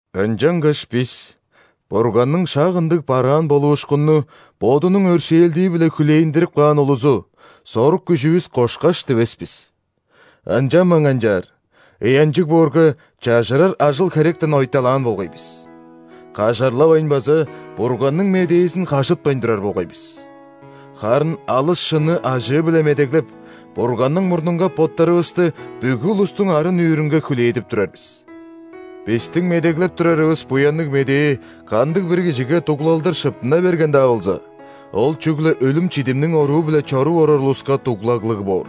Ынчангаш бис – Бурганның шак ындыг бараан болуушкунну Бодунуң өршээлдии-биле хүлээндирип каан улузу, сорук-күжүвүс кошкаш дивес бис. Ынчанмайн канчаар, ыянчыг боорга, чажырар ажыл-херектен ойталаан болгай бис; кажарлавайн база Бурганның Медээзин хажытпайн турар болгай бис. Харын алыс шынны ажыы-биле медеглеп, Бурганның мурнунга боттарывысты бүгү улустуң арын-нүүрүнге хүлээдип турар бис. Бистиң медеглеп турарывыс Буянныг Медээ кандыг-бир кижиге дуглалдыр шыптына берген-даа болза, ол чүгле өлүм-чидимниң оруу-биле чоруп орар улуска дуглаглыг боор.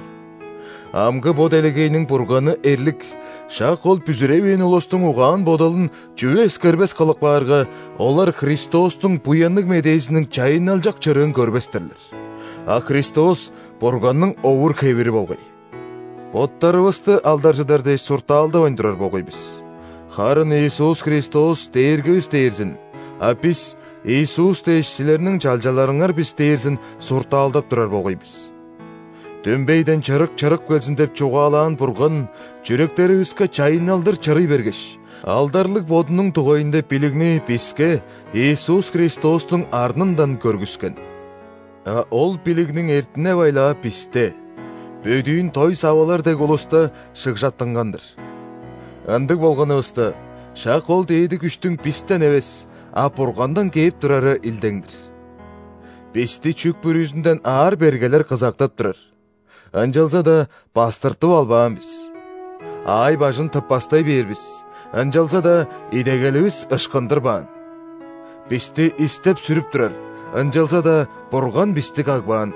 Амгы бо делегейниң «бурганы» – эрлик шак ол бүзүревээн улустуң угаан-бодалын чүве эскербес кылып каарга, олар Христостуң Буянныг Медээзиниң чайынналчак чырыын көрбес-тирлер, а Христос – Бурганның овур-хевири болгай. Боттарывысты алдаржыдар дээш суртаалдавайн турар болгай бис, харын Иисус Христос – Дээргивис дээрзин, а бис – Иисус дээш, силерниң чалчаларыңар бис дээрзин суртаалдап турар болгай бис. «Дүмбейден чырык чырып келзин» – деп чугаалаан Бурган чүректеривиске чайынналдыр чырый бергеш, алдарлыг Бодунуң дугайында билигни биске Иисус Христостуң арнындан көргүскен. А ол билигниң эртине-байлаа бисте – бөдүүн дой савалар дег улуста шыгжаттынган-дыр. Ындыг болганывыста, шак ол дээди күштүң бистен эвес, а Бургандан кээп турары илдең-дир. Бисти чүк бүрүзүнден аар-бергелер кызагдап турар, ынчалза-даа бастыртып албаан бис. Аай-бажын тыппастай бээр бис, ынчалза-даа идегеливис ышкындырбаан. Бисти истеп-сүрүп турар, ынчалза-даа Бурган бисти кагбаан.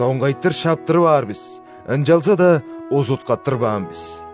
Доңгайтыр шаптырып аар бис, ынчалза-даа узуткаттырбаан бис.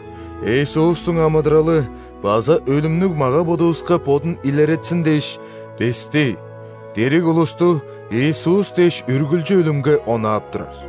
Иисустуң амыдыралы база өлүмнүг мага-бодувуска бодун илеретсин дээш, бисти – дириг улусту Иисус дээш үргүлчү өлүмге онаап турар.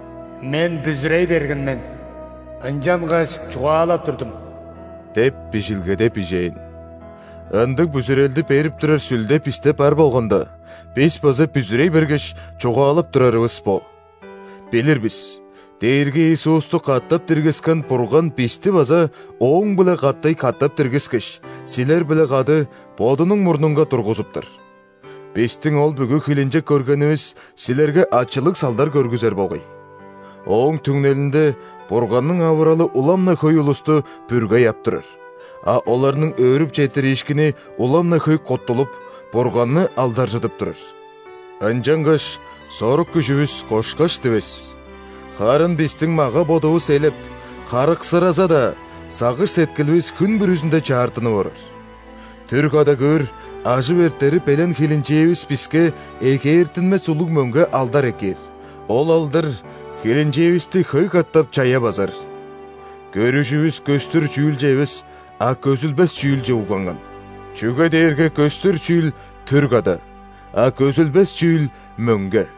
«Мен бүзүрей берген мен, ынчангаш чугаалап турдум» деп, Бижилгеде бижээн. Ындыг бүзүрелди берип турар Сүлде бисте бар болганда, бис база бүзүрей бергеш, чугаалап турарывыс бо. Билир бис: Дээрги Иисусту катап диргискен Бурган бисти база Ооң-биле катай катап диргискеш, силер-биле кады Бодунуң мурнунга тургузуптар. Бистиң ол бүгү хилинчек көргенивис силерге ачылыг салдар көргүзер болгай. Ооң түңнелинде Бурганның авыралы улам-на хөй улусту бүргей ап турар; а оларның өөрүп четтириишкини улам-на хөй куттулуп, Бурганны алдаржыдып турар. Ынчангаш сорук-күжүвүс кошкаш дивес. Харын бистиң мага-бодувус элеп, харыксыраза-даа, сагыш-сеткиливис хүн бүрүзүнде чаартынып орар. Түр када көөр, ажып эртери белен хилинчээвис биске эгээртинмес улуг мөңге алдар эккээр, ол алдар хилинчээвисти хөй катап чая базар. Көрүжүвүс көстүр чүүлче эвес, а көзүлбес чүүлче угланган. Чүге дээрге көстүр чүүл – түр када, а көзүлбес чүүл – мөңге.